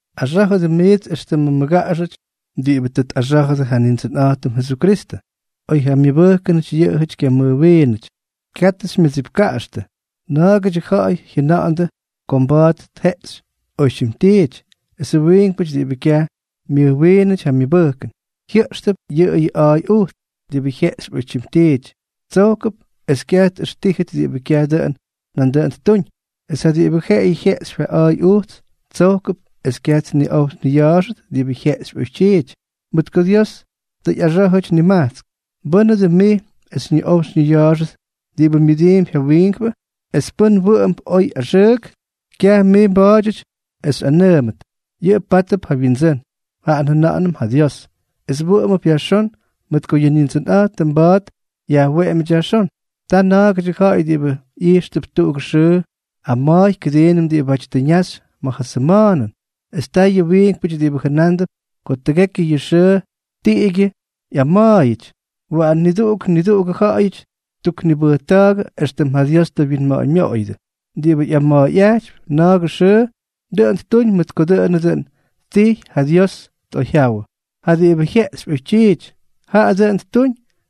Axá̱jʉdʉ miits éxtʉmʉ mmʉgaꞌaxʉty ja diꞌibʉ tʉ tꞌaxá̱jʉdʉ ja Nindsʉnꞌa̱jtʉm Jesukristʉ, oy ja myʉbʉjkʉnʉty yʉꞌʉjʉty kyamʉjwiinʉty. Katʉ xymyʉdsipka̱jxtʉ. Na̱a̱gʉdyʉ ja̱ꞌa̱y jyʉna̱ꞌa̱ndʉ ko mba̱a̱t tjeꞌxy oytyim tiity, esʉ wiinkpʉty diꞌibʉ kyaj myʉjwiinʉty ja myʉbʉjkʉn, jyʉꞌxtʉp yʉꞌʉyʉ a̱a̱y ujts. Diꞌibʉ jyeꞌxypy oytyim tiity, tsojkʉp es kyaj tꞌʉxtíjʉt diꞌibʉ kyaj dʉꞌʉn nandʉꞌʉn ttuñ; es ja diꞌibʉ jeꞌeyʉ jyeꞌxypy ja a̱a̱y ujts, tsojkʉp es kyaj tniꞌow tniya̱a̱xʉt diꞌibʉ jyeꞌxypy oytyiity, mʉt ko Dios tʉ ꞌyaxá̱jʉty nimajtsk. ¿Mbʉ́nʉ dʉn mij es xyñiꞌow xyñiya̱a̱xʉt diꞌibʉ myʉdiimpy ja wiinkpʉ? Es pʉn wʉꞌʉmp oy o axʉʉk, kyaj mij mba̱a̱dyʉty es xyꞌanʉʉmʉt. Yʉꞌʉ pátʉp ja wyindsʉ́n, jaꞌa njʉna̱ꞌa̱nʉm ja Dios. Es wʉꞌʉmʉp yajxón, mʉt ko yʉ Nindsʉnꞌa̱jtʉm mba̱a̱t yajweꞌemyʉty yajxón. Ta na̱a̱gʉdyʉ ja̱ꞌa̱y diꞌibʉ ꞌyijxtʉp tuꞌugʉ xʉʉ ama̱a̱y kʉdiinʉm diꞌibáty tʉ ñaxy ma̱ ja sʉma̱a̱nʉn, es ta yʉ wiinkpʉty diꞌibʉ jʉnándʉp ko tʉgekyʉ yʉ xʉʉ tiꞌigyʉ ꞌyama̱a̱yʉty. Waꞌan niduꞌuk niduꞌugʉ ja̱ꞌa̱yʉty ttuknibʉjta̱a̱gʉ éxtʉm ja Dios tʉ wyinma̱ꞌa̱ñmyoꞌoyʉdʉ. Diꞌibʉ ꞌyama̱a̱yꞌajtypy na̱a̱gʉ xʉʉ, dʉꞌʉn ttuñ mʉt ko dʉꞌʉnʉ dʉn ttijy ja Dios tꞌoyjyawʉ. Jaꞌa diꞌibʉ jyeꞌxypy oytyiity, jaꞌa dʉꞌʉn ttuñ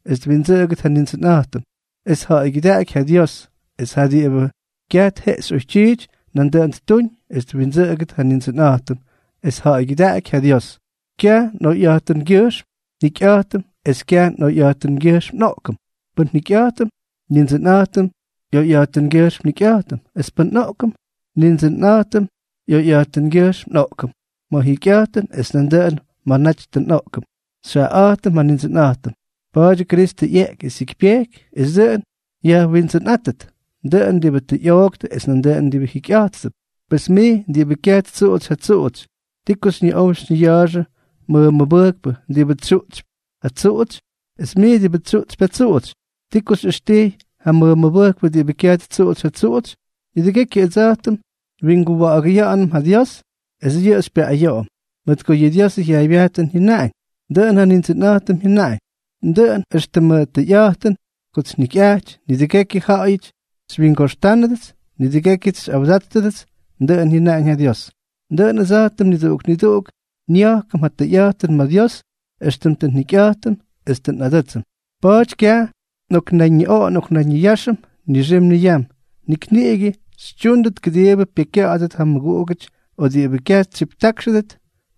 es twindsʉꞌʉgʉt ja Nindsʉnꞌa̱jtʉm, es tja̱ꞌa̱ygyʉdaꞌaky ja Dios; es jaꞌa diꞌibʉ kyaj tjeꞌxy oytyiity, nandʉꞌʉn ttuñ es twindsʉꞌʉgʉt ja Nindsʉnꞌa̱jtʉm, es tja̱ꞌa̱ygyʉdaꞌaky ja Dios. Kyaj nꞌoyꞌa̱jtʉngyʉjxm njikyꞌa̱jtʉm es kyaj nꞌoyꞌa̱jtʉngyʉjxm nꞌoꞌkʉm. Pʉn njikyꞌa̱jtʉm, Nindsʉnꞌa̱jtʉm ꞌyoyꞌa̱jtʉngyʉjxm njikyꞌa̱jtʉm; es pʉ́n nꞌoꞌkʉm, Nindsʉnꞌa̱jtʉm ꞌyoyꞌa̱jtʉngyʉjxm nꞌoꞌkʉm. Ma̱ njikyꞌa̱jtʉm es nandʉꞌʉn ma̱ naty tʉ nꞌoꞌkʉm, xyjaꞌaꞌa̱jtʉm ja Nindsʉnꞌa̱jtʉm. Pa̱a̱dyʉ Kristʉ ꞌyeꞌky es jyikypyejky es dʉꞌʉn yajWindsʉnꞌátʉt, dʉꞌʉn diꞌibʉ tʉ ꞌyooktʉ es nandʉꞌʉn diꞌibʉ jikyꞌa̱jttʉp. Pes mij diꞌibʉ kyaj ttsuꞌutsy ja tsuꞌutsy, ¿ti ko xyñiꞌow xyñiya̱a̱xʉ mmʉmʉbʉjkpʉ diꞌibʉ tsyuꞌtsypy ja tsuꞌutsy? Es mij diꞌibʉ tsyuꞌtsypy ja tsuꞌutsy, ¿ti ko xyꞌʉxtijy ja mmʉmʉbʉjkpʉ diꞌibʉ kyaj ttsuꞌutsy ja tsuꞌutsy? Nidʉgekyʉ ʉdsa̱jtʉm nwinguwa̱ꞌa̱gʉya̱ꞌa̱nʉm ja Dios, es yʉꞌʉ xypyayoꞌoyʉm. Mʉt ko yʉ Diosʉ jyaaybyajtʉn jyʉnaꞌañ: Dʉꞌʉn ja Nindsʉnꞌa̱jtʉm jyʉnaꞌañ: Dʉꞌʉn éxtʉmʉ tʉyꞌa̱jtʉn kots njikyꞌaty, nidʉgekyʉ ja̱ꞌa̱yʉty xywyingoxtánʉdʉts, nidʉgékyʉts xyꞌawdáttʉdʉts, dʉꞌʉn jyʉnáñ ja Dios. Dʉꞌʉn ʉdsa̱jtʉm niduꞌuk niduꞌuk nya̱jkʉm ja tʉyꞌa̱jtʉn ma̱ Dios éxtʉm tʉ njikyꞌa̱jtʉm es tʉ nꞌadʉ́tsʉm. Pa̱a̱ty kyaj nꞌoknayñiꞌoꞌo nꞌoknayñiyáxʉnʉm nixim niyam. Nik niꞌigʉ xytyúndʉt kʉdiibʉ pyekykya̱ꞌa̱dʉt ja mmʉguꞌugʉty o diꞌibʉ kyaj tsyiptákxʉdʉt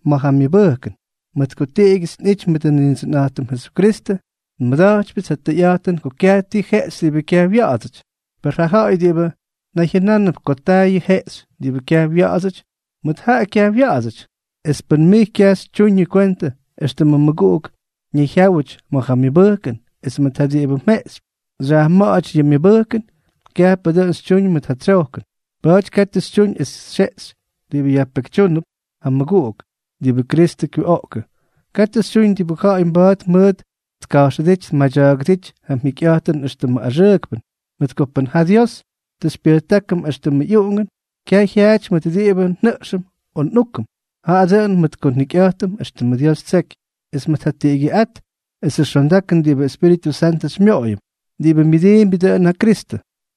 ma̱ ja myʉbʉjkʉn. Mʉt ko tiꞌigyʉts nꞌity mʉt ja Nindsʉnꞌa̱jtʉm Jesukristʉ, nmʉda̱jtypyʉts ja tʉyꞌa̱jtʉn ko kyaj ti jeꞌxy diꞌibʉ kyaj wya̱ꞌa̱dsʉty. Per ja ja̱ꞌa̱y diꞌibʉ nayjyʉnánʉp ko taa yʉ jeꞌxy diꞌibʉ kyaj wya̱ꞌa̱dsʉty, mʉt jaꞌa kyaj wya̱ꞌa̱dsʉty. Es pʉn mij kyaj xytyuñʉ kwentʉ éxtʉmʉ mmʉguꞌuk ñayjyáwʉty ma̱ ja myʉbʉjkʉn, es mʉt ja diꞌibʉ mjeꞌxypy xyajma̱ꞌa̱ty yʉ myʉbʉjkʉn, kyajpʉ dʉꞌʉn xytyuñ mʉt ja tsojkʉn. Pa̱a̱ty katʉ xytyuñ es xyjeꞌxy diꞌibʉ yajpekytyúnʉp ja mmʉguꞌuk diꞌibʉ Kristʉ kyuꞌoꞌkʉ. Katʉ xytyuñ diꞌibʉ ja̱ꞌa̱y mba̱a̱t mʉʉt tka̱jxʉdíty tmadya̱a̱gʉdíty ja mjikyꞌa̱jtʉn éxtʉmʉ axʉʉkpʉn. Mʉt ko pʉn ja Dios tʉ xypyʉjtákʉm éxtʉmʉ ꞌyuꞌungʉn, kyaj jyaꞌajʉty mʉt diꞌibʉ njʉꞌxʉm o nꞌúkʉm, jaꞌa dʉꞌʉn mʉt ko njikyꞌa̱jtʉm éxtʉmʉ Dios ttseky, es mʉt ja tiꞌigyʉꞌát esʉ xondakʉn diꞌibʉ Espíritʉ Santʉ xymyoꞌoyʉm. Diꞌibʉ myʉdiimbyʉ dʉꞌʉn ja Kristʉ,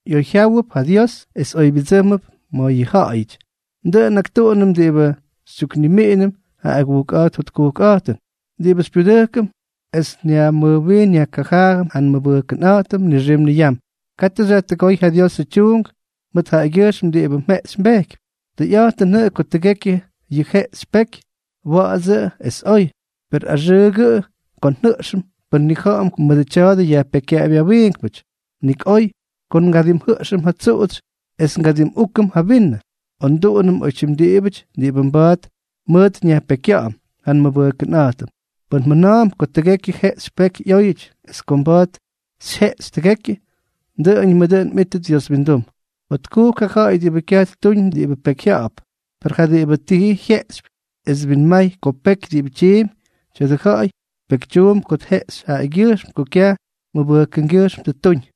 ꞌyoyjyáwʉp ja Dios es oybyʉdsʉ́mʉp ma̱ yʉ ja̱ꞌa̱yʉty. Dʉꞌʉn nꞌaktuꞌunʉm diꞌibʉ xytyuknimiꞌinʉm ja agujkꞌa̱jt jotkujkꞌa̱jtʉn, diꞌibʉ xypyudʉjkʉm es nyajmʉjwiin nyajkajaajʉm ja nmʉbʉjkʉnꞌa̱jtʉm nixim niyam. Katʉ xyajtʉgóy ja Diosʉ tyuunk mʉt jaꞌagyʉjxm diꞌibʉ mjeꞌxy mbejkypy. Tʉyꞌa̱jtʉnʉꞌʉ ko tʉgekyʉ yʉ jeꞌxy peky, wa̱ꞌa̱dsʉꞌʉ es oy, per axʉʉgʉꞌʉ ko njʉꞌxʉm pʉn nnija̱ꞌa̱m ko mʉdʉ tya̱a̱dʉ yajpekykyaꞌapy ja wiinkpʉty. Nik oy ko ngadimjʉꞌxʉm ja tsuꞌutsy es ngadimꞌúkʉm ja vinʉ, o nduꞌunʉm oytyim diꞌibʉty diꞌibʉ mba̱a̱t mʉʉt nyajpekykya̱ꞌa̱m ja nmʉmʉbʉjkpʉꞌa̱jtʉm. Pʉn mjʉna̱a̱mp ko tʉgekyʉ jeꞌxy peky ꞌyóyʉty es ko mba̱a̱t xyjeꞌxy tʉgekyʉ, dʉꞌʉñʉmʉ dʉꞌʉn mꞌítʉt Dios windum. Jotkujk ja ja̱ꞌa̱y diꞌibʉ kyaj ttuñ diꞌibʉ pyekyjya̱ꞌa̱p. Per ja diꞌibʉ ti jyeꞌxypy es twinmay ko peky diꞌibʉ tyiimpy, tya̱dʉ ja̱ꞌa̱y pekytyuump ko tjeꞌxy jaꞌagyʉjxm ko kyaj mʉbʉjkʉngyʉjxm tʉ ttuñ.